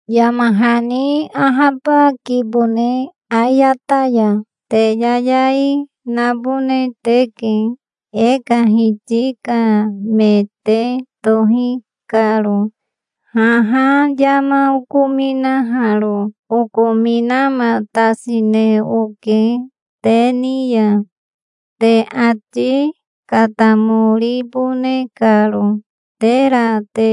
Yama hani ahabakibone ayata ya. Te yayai nabone teke, e ka Hiti ka me te tohi karo. Haha yama okominaharo okominamatasine oke te ni ya, te ati katamoribone karo, tera te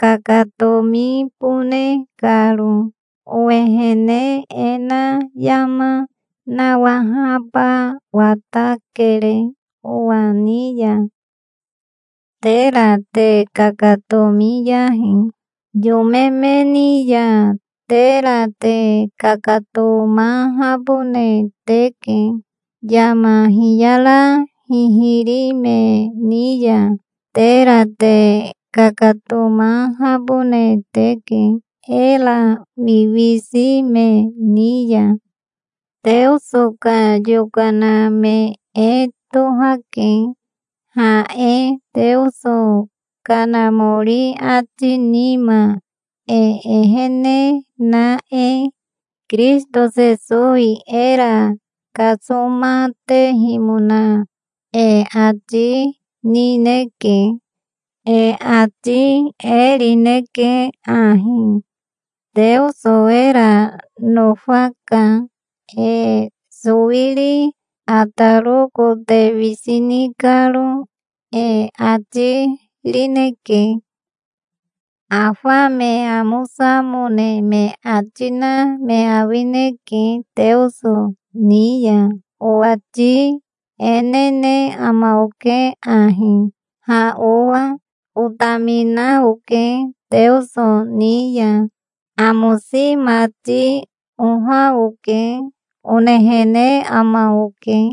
kakatomibone karo. Owehene e na yama nawahaba watakere owa ni ya. Tera te kakatomiyahi yome me ni ya. Tera te kakatomahabone teke, yama hiyara hihiri me ni ya. Tera te kakatomahabone teke, era wiwisi me ni ya. Teoso ka yokana me e tohake, ha e, Teoso Kanamori ati nima e ehene na e. Kirisito Sesowi era kasomatehimona e ati nineke. E ati e rineke ahi: "Teoso era nofaka, e sowiri ataro kote wisi ni karo", e ati rineke. Afa me amosamone me ati na me awineke Teoso ni ya. Owati e nene ama oke ahi, "Ha owa otamina oke Teoso ni ya. Amosi mati oha oke", onehene ama oke.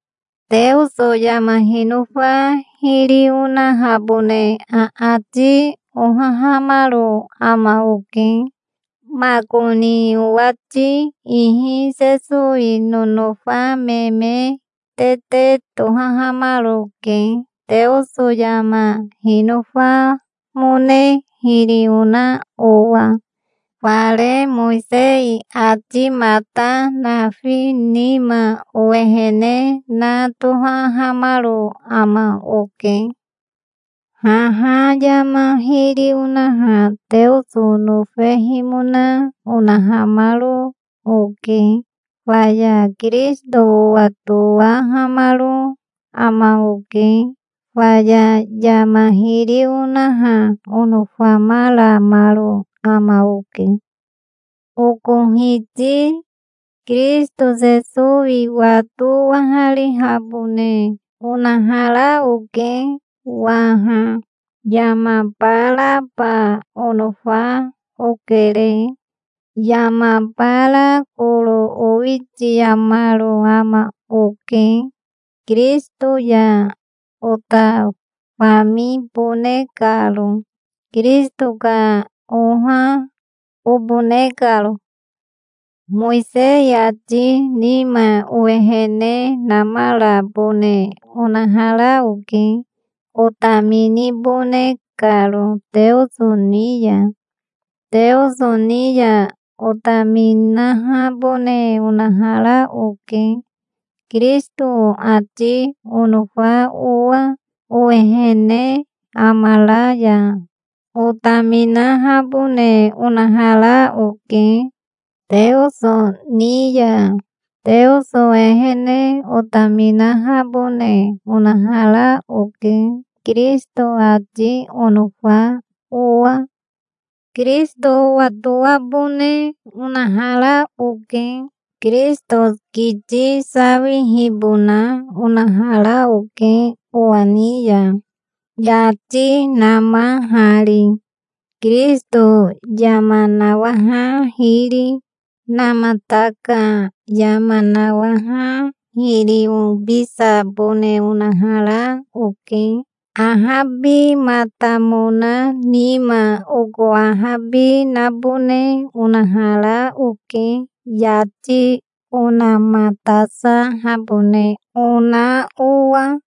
Teoso yama hinofa hiri onahabone aati ohahamaro ama oke. Makoni owati ihi Sesowi nonofa me me tete tohahamaroke, Teoso yama hinofamone hiri ona owa. Fare Mowisei atimata nafi nima owehene na tohahamaro ama oke. Haha yama hiri onaha Teoso nofehimona onahamaro oke. Faya Kirisito owatowahamaro ama oke. Faya yama hiri onaha onofamaramaro ama oke. Oko Hiti Kirisito Sesowi wato owaharihabone onahara oke waha. Yama baraba onofa okere. Yama bara koro owitiamaro ama oke, Kirisito ya ota famibone karo, Kirisito ka oha obone karo. Mowisei ati nima owehene namarabone onahara oke, otaminibone karo Teoso ni ya. Teoso ni ya otaminahabone onahara oke, Kirisito ati onofa owa. Owehene amara ya otaminahabone onahara oke Teoso ni ya. Teoso ehene otaminahabone onahara oke, Kirisito ati onofa owa. Kirisito owatoabone onahara oke. Kirisito kiti sawihibona onahara oke owa ni ya, yati namahari. Kirisito yama nawaha hiri namata ka yama nawaha hiri obisabone onahara oke. Ahabimatamona nima oko ahabi nabone onahara oke, yati onamatasahabone ona owa.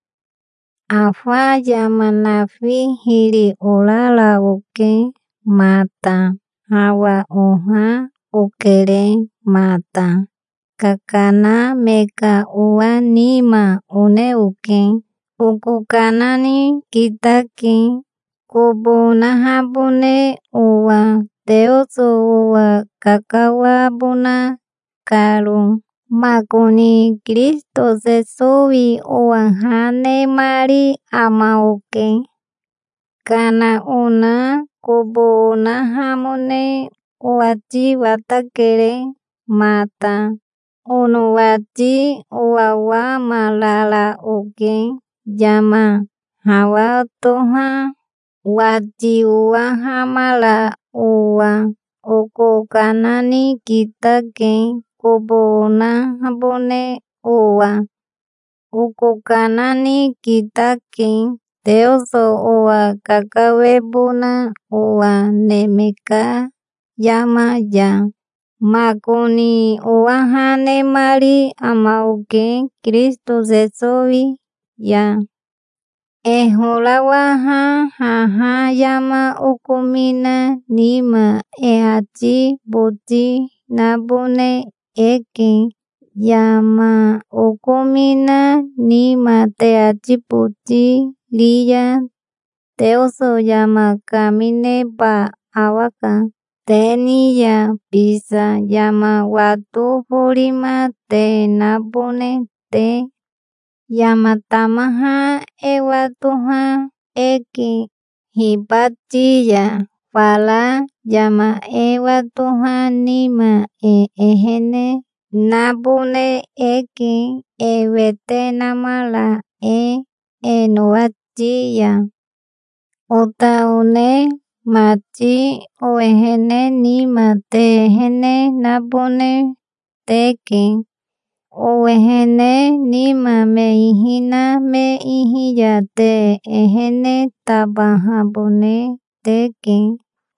Afa yama nafi hiri orara oke mata. Hawa oha okere mata. Kakana me ka owa nima one oke. Oko kana ni kitake, kobo onahabone owa, Teoso owa kakawabona karo. Makoni Kirisito Sesowi owa ha nemari ama oke. Kana ona kobo onahamone owati watakere mata. Onowati owawamarara oke, yama hawa toha wati owahamara owa. Oko kana ni kitake, kobo onahabone owa. Oko kana ni kitake, Teoso owa kakawebona owa neme ka yama ya. Makoni owa ha nemari ama oke Kirisito Sesowi ya. E horawaha haha yama okomina nima e ati boti nabone eke. Yama okomina nima te ati boti ri ya Teoso yama kamineba awaka te ni ya bisa, yama wato forima te nabone te. Yama tamaha e watoha eke hibati ya. Fara yama e watoha nima e ehene nabone eke, e wete namara e e nowati ya. Ota one mati, owehene nima te ehene nabone teke. Owehene nima me ihi na me ihi ya te ehene tabahabone teke.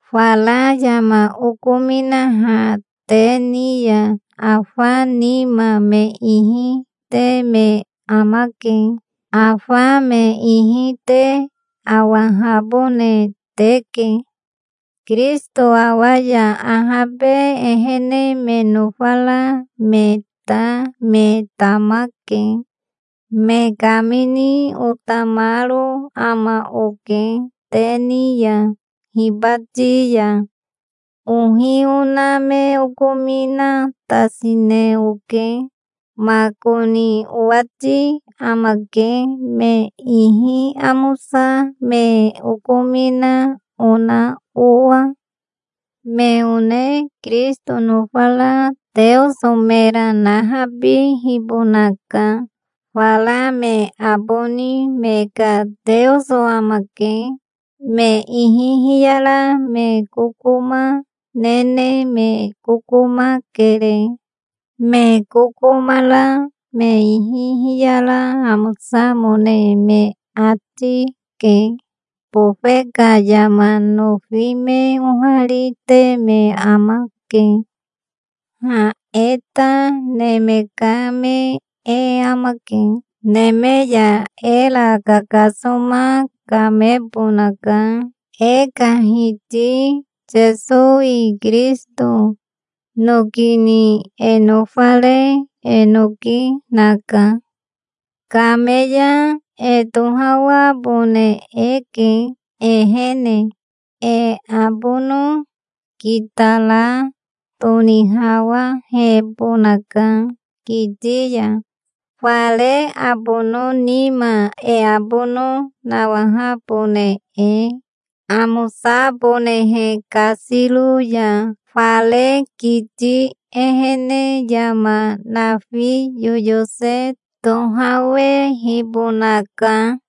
Fara yama okominaha te ni ya afa nima me ihi te me amake. Afa me ihi te awahabone teke. Kirisito awa ya ahabe ehene me nofara me ta me tamake. Me kamini otamaro ama oke te ni ya hibati ya. Ohi ona me okominatasine oke. Makoni owati amake, me ihi amosa me okomina ona owa. Me one Kirisito nofara Teoso mera nahabibonaka. Fara me aboni me ka teoso amake. Me ihi hiyara me kokoma nene me kokoma kere. Me kokoma ra me ihi hiyara amosamone me ati ke. Bofe ka yama nofi me oharite me amake. Ha e ta neme ka me e amake. Neme ya era Kakasoma kamebonaka, e ka Hiti Sesowi Kirisito. Noki ni e nofare e noki naka. Kame ya e tohawabone eke ehene. E abono kitara tonihawahebonaka kiti ya, fare abono nima e abono nawahabone e, amosabonehe kasiro ya. Fare kiti ehene yama nafi yoyose tohawehibonaka.